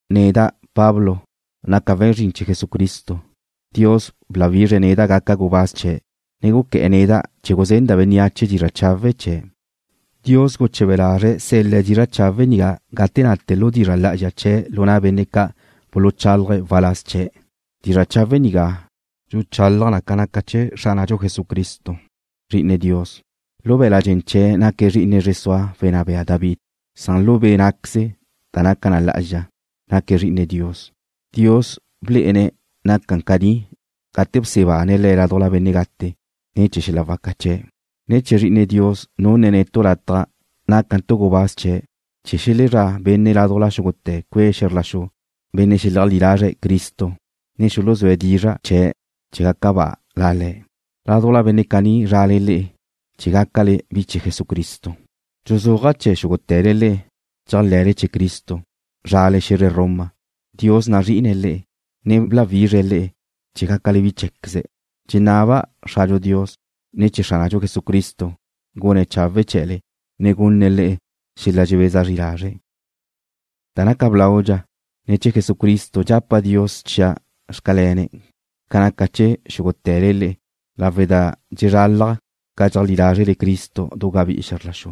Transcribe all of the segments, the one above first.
Neda', Pablo, naca' we̱n zrin chee̱ Jesucristo. Dios bláwizre̱' neda' chee̱ gaca' gubáz chee̱', ne guqué̱'e̱ neda' chee̱ guzenda' bénneache dizra' chawe' chee̱'. Dios guche̱be lazre̱' sel-le̱' dizra' chawe' nigá gate nate lu dizra' lá'azxa chee̱' lu na' benne' ca' buluchálaje̱' waláz chee̱'. Dizra' chawe' nigá dxulé'e na ca naca chee̱ Xránadxu Jesucristo, Zri'ine Dios. Lu be̱la' dxen chee̱' naque̱' zri'ine zre sua wenná bea David. Lu be' nácaqueze̱' da naca na lá'azxa, naque̱' Zri'ine Dios. Dios blé'ene̱' naca caní gate bsebane̱' Le̱' ládujla benne' gate ne̱ chee̱ xel-la waca chee̱'. Ne̱ chee̱ Zrí'ine̱' Dios nunne̱' netu' lataj nácantu' gubáz chee̱' chee̱ xelezrá' benne' ládujla xúgute̱ cue' xe̱zr la xu, benne' xeleajlí lazre̱' Cristo, ne xuluzúe̱' dizra' chee̱' chee̱ gaca ba La Le̱'. Ládujla benne' caní zrale le'e chee̱ gácale bi chee̱ Jesucristo. Dxuzúaja' chee̱ xúgute̱le le'e dxéajle̱le chee̱ Cristo, zrale xe̱zre Roma. Dios nazrí'ine̱' le'e, ne bláwizre̱' le'e chee̱ gácale bi cheé̱queze̱'. Dxenaba' Xradxu Dios, ne Xránadxu Jesucristo gune̱' chawe' chee̱le, ne gunne̱' le'e xel-la dxebeza zri lazre'. Da naca blaudxa, ne̱ chee̱ Jesucristo dxapa' Dios chia' xcalene̱' ca naca chee̱ xúgute̱le lawe' da dxezralaj ca dxeajlí lázrele Cristo du gabí'i xe̱zr la xu.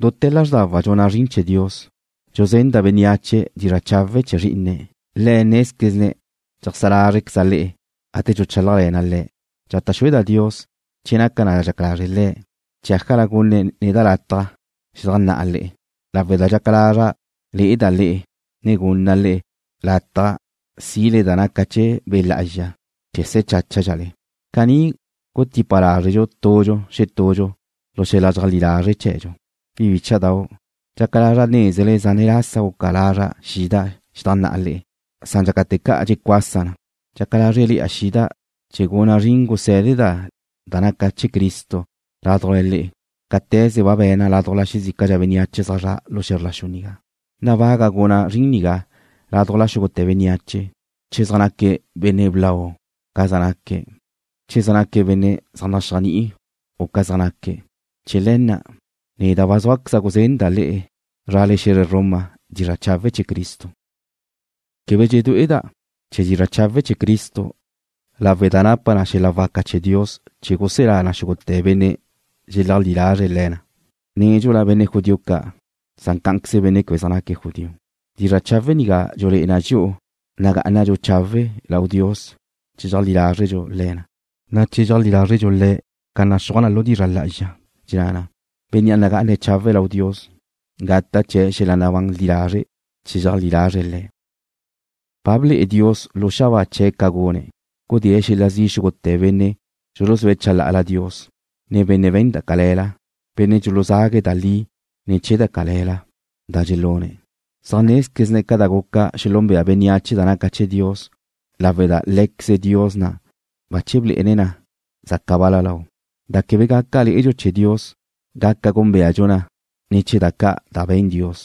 Duté̱ lázrdawa' dxuna' zrin chee̱ Dios, dxuzenda' bénneache dizra' chawe' chee̱ Zrí'ine̱'. Le̱' nézquezne̱' dxeajsá lázrqueza' le'e gate dxuchálajle̱na' Le'. Dxata' xúeda' Dios, che naca da dxaca lazre' Le̱', chee̱ ájala gunne̱' neda' lataj xedajnná'a le'e lawe' da dxaca lazra' le'eda' le'e ne gunna' le'e lataj si'le da naca chee̱ Be' Lá'azxa, chee̱ se̱ cháchadxale. Caní gutipa lázredxu tudxu xetudxu lu xel-la dxeajlí lazre' chee̱dxu. Bi bícha'dau', dxaca lazra' nézele zane' lasa guca lazra' xida' xedajnná'a le'e, san dxácate̱ ca' dxecuasa na. Dxaca lázrele̱'a xida' chee̱ guna' zrin gusé̱deda' da naca chee̱ Cristo ládujla le'e, cáte̱ze ba be̱na' ládujla xezícadxa bénneache zaj zre̱'e̱ lu xe̱zr la xu nigá. Nabaga' guna' zrin caní ládujla xúgute̱ bénneache, che zaj naque̱' benne' blau u ca zaj naque̱', u che zaj naque̱' benne' zaj naxéajni'i u ca zaj naque̱'. Chee̱ le̱ na', neda' ba zúaqueza' guzenda' le'e zrale xe̱zre Roma dizra' chawe' chee̱ Cristo. Quebe dxedué'eda' chee̱ dizra' chawe' chee̱ Cristo lawe' da napa na xel-la waca chee̱ Dios chee̱ guselá na xúgute̱ benne' dxeleajlí lazre̱' le̱ na, nédxula benne' judío ca', san cá'anqueze benne' quebe zaj naque̱' judío. Dizra' chawe' nigá dxulé'e na dxi'u nagá'anadxu chawe' lau Dios che dxeajlí lázredxu le̱ na, chee̱ cheajlí lázredxu Le̱' ca naxúaj na lu dizra' lá'azxa, da dxenná na: Benne' nagá'ane̱' chawe' lau Dios gata' chee̱' xel-la nabán li lazre' che dxeajlí lazre̱' Le̱'. Ba ble'e Dios lu xabáa chee̱' ca gune̱', gudée̱' xel-la zi' xúgute̱ benne' dxuluzúe̱' chalá'ala Dios, ne benne' we̱n da cale̱la, benne' dxuluzague̱' da li ne̱ chee̱ da cale̱la da dxelune̱'. Zaj nézquezne̱' ca gaca xelúnbea bénneache da naca chee̱ Dios lawe' da Lé̱queze Dios na' bache blé'ene̱' na zaca ba lau. Da quebe gaca lé'edxu chee̱ Dios gaca gúnbeadxu na ne̱ chee̱ da ca' da be̱n Dios.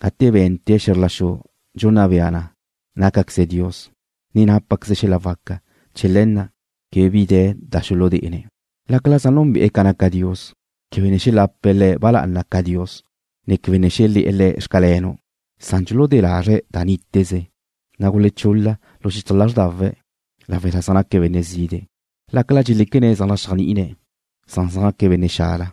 Gate be̱nte̱' xe̱zr la xu dxunna bea na nácaqueze Dios, ne nápaqueze̱' xel-la waca. Chee̱ le̱ na' quebe bi de̱ xuludé'ene̱'. Lácala zaj núnbe'e̱ ca naca Dios, quebe ne xelape̱' Le̱' ba lá'ana ca Dios, ne quebe ne xelé̱'e̱ Le̱'; Xcalenu', san dxuludé lazre̱' da níteze, na' gulechul-la xichaj lázrdawe̱' lawe' da zaj naque̱' benne' zide'. Lácala dxeléquene̱' zaj naxéajni'ine̱', da li zaj naque̱' benne' xala,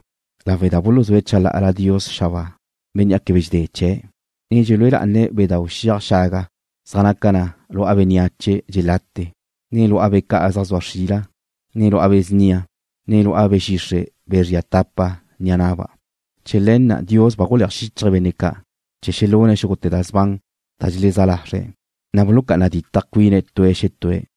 lawe' da buluzúe̱' chalá'ala Dios xabáa, Bénnea' quebe dxedé chee̱', ne dxelúe lá'ane̱' bedáu' xiaj xaga zaj naca na lu'a bénneache dxelate, ne lu'a bea ca' zaj zua xrila, ne lu'a be̱ snia, ne lu'a be̱ xixre' be̱ zria tapa ni'a na'ba'. Chee̱ le̱ na' Dios ba guleaj xíchaje̱' benne' ca' chee̱ xelune̱' xúgute̱ da sban da dxelezá lazre̱', na' bulucá'ana ditaj cuine̱' tue̱' xetue̱',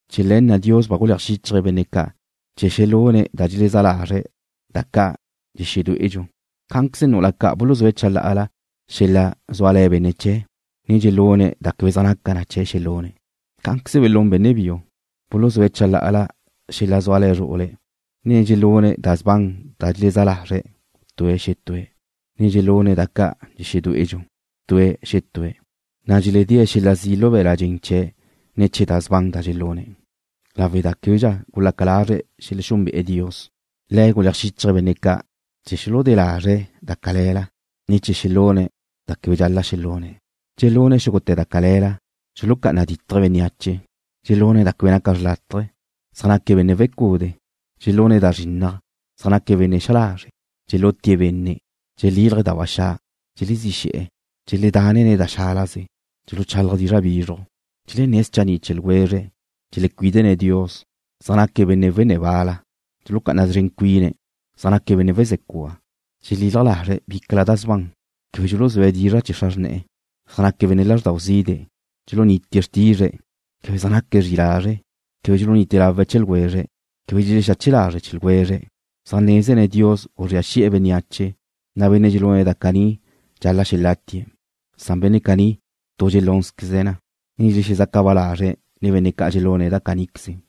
Chee̱ le̱ na' Dios ba guleaj xíchaje̱' benne' ca' chee̱ xelune̱' da dxelezá lazre̱' da ca' xedué'edxu. Cá'anqueze nu'ula buluzúe̱' chalá'ala xel-la zúale̱ benne' chee̱', ne dxelune̱' da quebe zaj naca chee̱' xelune̱'. Cá'anqueze belún benne' biu, buluzúe̱' chalá'ala xel-la zúale̱ zru'ule̱', ne dxelune̱' da sban da dxelezá lazre̱' tue̱' xetue̱', ne dxelune̱' da ca' xedué'edxu tue̱' xetue̱', na' dxeledée̱' xel-la zi' lu be̱l-la' dxen chee̱' ne̱ chee̱ da sban da dxelune̱'. Lawe' da québedxa gulaca lazre̱' xelexúnbe'e̱ Dios, Le̱' guleaj xíchaje̱' benne' ca' chee̱ xuludé lazre̱' da cale̱la, ne chee̱ xelune̱' da quebe dxal-la' xelune̱'. Dxelune̱' xúgute̱ da cale̱la. Dxulucá'ana ditje̱' bénneache. Dxelune̱' da quebe naca xrlátaje. Zaj naque̱' benne' wecude'. Dxelune̱' da zrinnaj. Zaj naque̱' benne' xa lazre'. Dxelutie̱' benne'. Dxelílaje̱' da ba xa'. Dxelezí xe̱'e̱. Dxeledanne̱' da xálaze. Dxuluchálaje̱' dizra' bizruj. Dxelenné̱' schanni' chee̱ ljwezre̱'. Dxelecuídene̱' Dios. Zaj naque̱' benne' wenné̱ wal-la. Dxulucá'ana szren cuine̱'. Zaj naque̱' benne' wezé cua. Dxelalaj lazre̱' bícala da sban. Quebe dxuluzúe̱' dizra' chee̱ xra xrne̱'e̱. Zaj naque̱' benne' lázrdau zide'. Dxulunitie̱' xrtizre̱'. Quebe zaj naque̱' zri'i lazre'. Quebe dxulunite lawe̱' chee̱ ljwezre̱'. Quebe dxelexache lazre̱' chee̱ ljwezre̱'. Zaj nézene̱' Dios guzría xi'e̱ bénneache, na' benne' dxelune̱' da caní dxal-la' xelátie̱'. Benne' caní tu dxelúnzqueze̱' na, ne dxelexezaca ba lazre̱' nen benne' dxelune̱' da caníqueze.